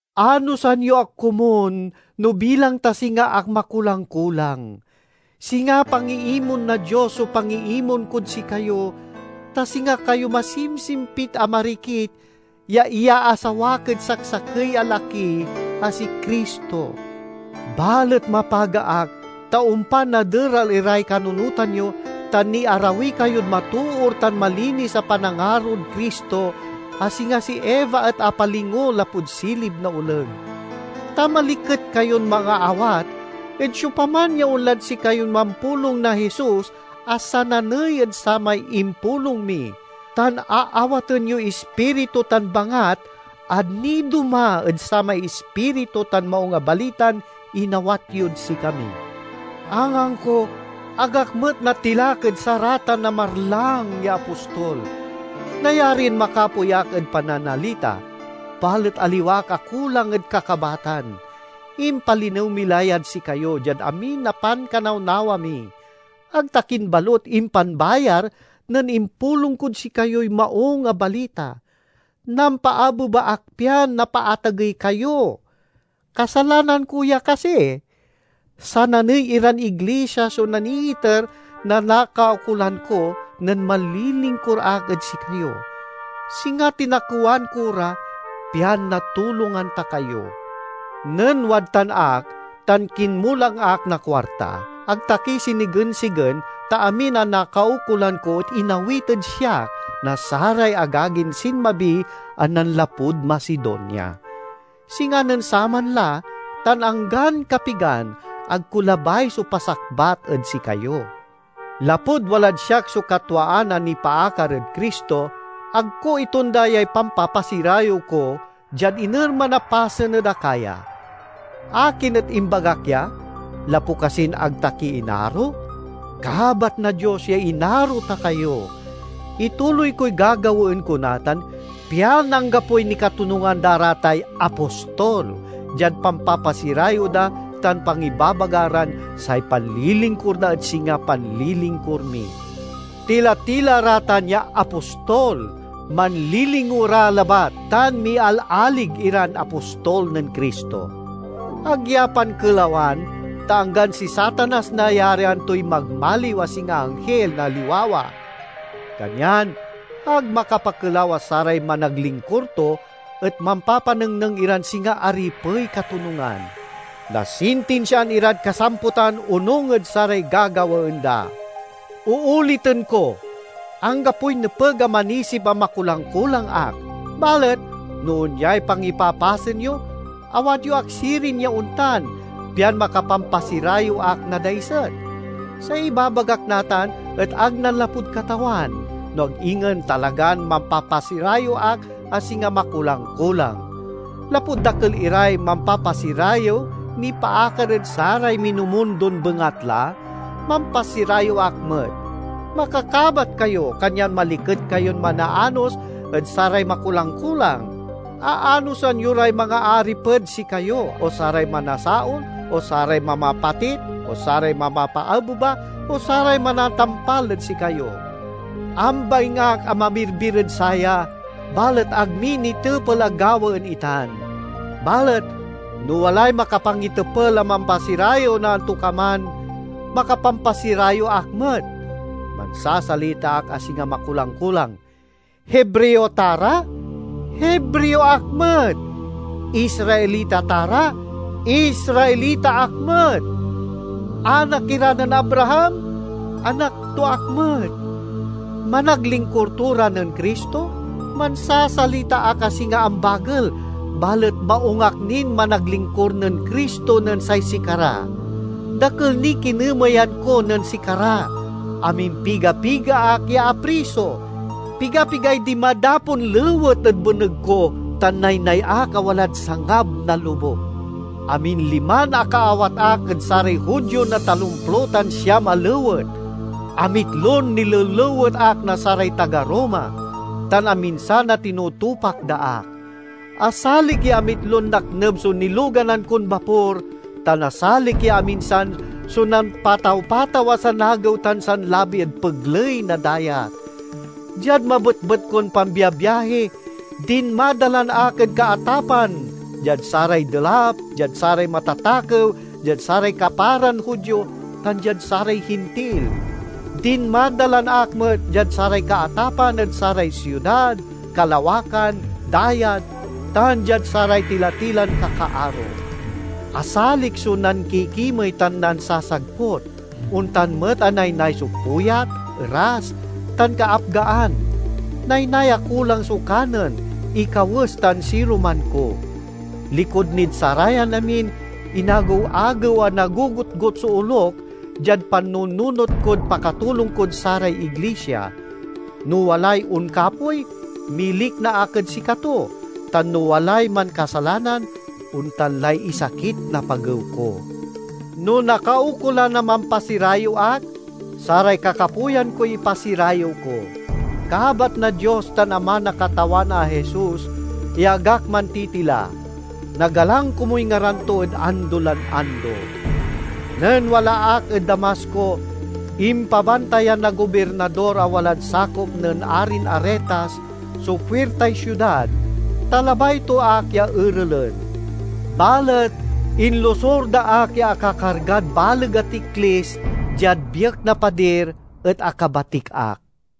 Anosan yo ak komun no bilang ta singa ak makulang-kulang. Singa pangiimon na Dios so pangiimon kod sikayo, ta singa kayo masimsimpit a marikit ya iyaasawak ed saksakey a laki a si Cristo. Balet mapaga ak, ta ompan naderal iray kanunotan yo tan niarawi kayod matoor tan malinis a panangarod Cristo, a singa si Eva et apalingo lapud silib na oleg. Ta maliket kayon mangaawat ed siopaman ya onlad sikayon mampulong na Jesus a sananey ed samay impulong mi; tan aawaten yoy ispiritu tan bangat a nidoma ed samay Ispiritu tan Maung a Balitan inawat yod sikami. Angangko, ag ak met natilak ed saratan a marlang ya "apostol". Nayarin makapoy ak ed pananalita, balet aliwa ak a kulang ed kakabatan. Impalinew mi la yad sikayo diad amin a pankanawnawa mi. Ag ta kin balut impanbayar nen impulong kod sikayoy Maung a Balita; nampaabeba ak pian napaatagey kayo. Kasalanan ko ya kasi? Sananey iran iglisia so naniiter na nakaukolan ko nen manlilingkur ak ed sikayo. Singa tinakewan ko ra, pian natulongan ta kayo. Nen wadtan ak tan kinmulang ak na kuarta, ag ta ki sinigensigen, ta amin a nakaukolan ko et inawit ed siak na saray agagin sinmabi a nanlapud Macedonia. Singa nen saman la, tan anggan kapigan, ag ko labay so pasakbat ed sikayo. Lapud walad siak so katwaan a nipaakar ed Cristo, ag ko itonda yay pampapasirayew ko, diad inerman a pasen ed Acaya. Akin et imbagak ya? Lapu kasin ag ta ki inaro? Kabat na Dios ya inaro ta kayo! Ituloy koy gagawaen ko natan, pian anggapoy nikatonungan da ra tay "apostol" diad pampapasirayew da tan pangibabaga ran say panlilingkur da et singa panlilingkur mi. Tila-tila ra tan ya "apostol", manlilingo ra labat tan mialalig iran apostol nen Cristo. Ag ya pankelawan, ta anggan si Satanas nayarian toy magmaliw a singa anghil na liwawa! Kanyan ag makapakelaw a saray managlingkur to et mampapanengneng iran singa aripey katonungan. Nasintinsiaan irad kasamputan onung ed saray gagawaen da. Ooliten ko; anggapoy nepeg a manisip a makulang-kulang ak. Balet no onyay pangipapasen yo, awat yo ak sirin ya ontan, pian makapampasirayew ak na daiset. Say ibabagak natan et ag nanlapud Katawan, no ag ingen talagan mampapasirayew ak a singa makulang-kulang. Lapud dakel iray mampapasirayew nipaakar ed saray minumundon bengatla, mampasirayew ak met. Makakabat kayo, kanyan maliket kayon manaanos ed saray makulang-kulang! Aanosan yo ray mangaariped sikayo, o saray manasaol, o saray mamapatit, o saray mamapaabeba, o saray manatampal ed sikayo. Ambaing ak a mamirbir ed saya, balet ag mi nitepel a gawaen itan! Balet no walay makapangitepel a mampasirayew na antokaman, makapampasirayew ak met. (Mansasalita ak a singa makulang-kulang.) Hebreo ta ra? Hebreo ak met. Israelita ta ra? Israelita ak met. Anak ira nen Abraham? Anak to ak met. Managlingkur to ra nen Cristo? Mansasalita ak a singa ambagel, balet maung ak nin managlingkur nen Cristo nen say sikara. Dakel niy kinemeyan ko nen sikara, amimpiga-piga ak ya apriso, piga-pigay dinmadapon lewet ed beneg ko, tan naynay ak a walad sangab na lobuk. Aminliman akaawat ak ed saray Judio na talomplo tan siam a lewet. Amitlon nilelewet ak na saray taga Roma, tan aminsan a tinutupak da ak; asalik ya amitlon nakneb so niloganan kon bapor, tan asalik ya aminsan so nampataw-pataw a sanagew tan sanlabi ed pegley na dayat. Diad mabetbet kon pambiabiahi, dinmadalan ak ed kaatapan diad saray delap, diad saray matatakew, diad saray kaparan Judio, tan diad saray Hintil; dinmadalan ak met diad saray kaatapan ed saray siudad, kalawakan, dayat, tan diad saray tila-tilan kakaaro. Asalik so nankikimey tan nansasagput; ontan met a naynay so puyat, eras, tan kaapgaan. Naynay a kulang so kanen, ikawes tan siruman ko. Likud nin sarayan amin, inagew-agew a nagogotgot so olok diad pannununot kod pakatulong kod saray iglisia. No walay onkapoy, milikna ak ed sikato; tan no walay mankasalanan, ontan lay isakit na pagew ko. No nakaukolan a mampasirayew ak, saray kakapoyan koy ipasirayew ko. Kabat na Dios tan Ama na Katawan a Jesus ya ag ak mantitila. Nagalang komuy ngaran to ed ando lan ando. Nen wala ak ed Damasco, impabantayan na gobirnador a walad sakop nen arin Aretas so puirtay siudad, ta labay to ak ya erelen. Balet inlosur da ak ya akakargad baleg a tiklis, diad biek na padir, et akabatik ak.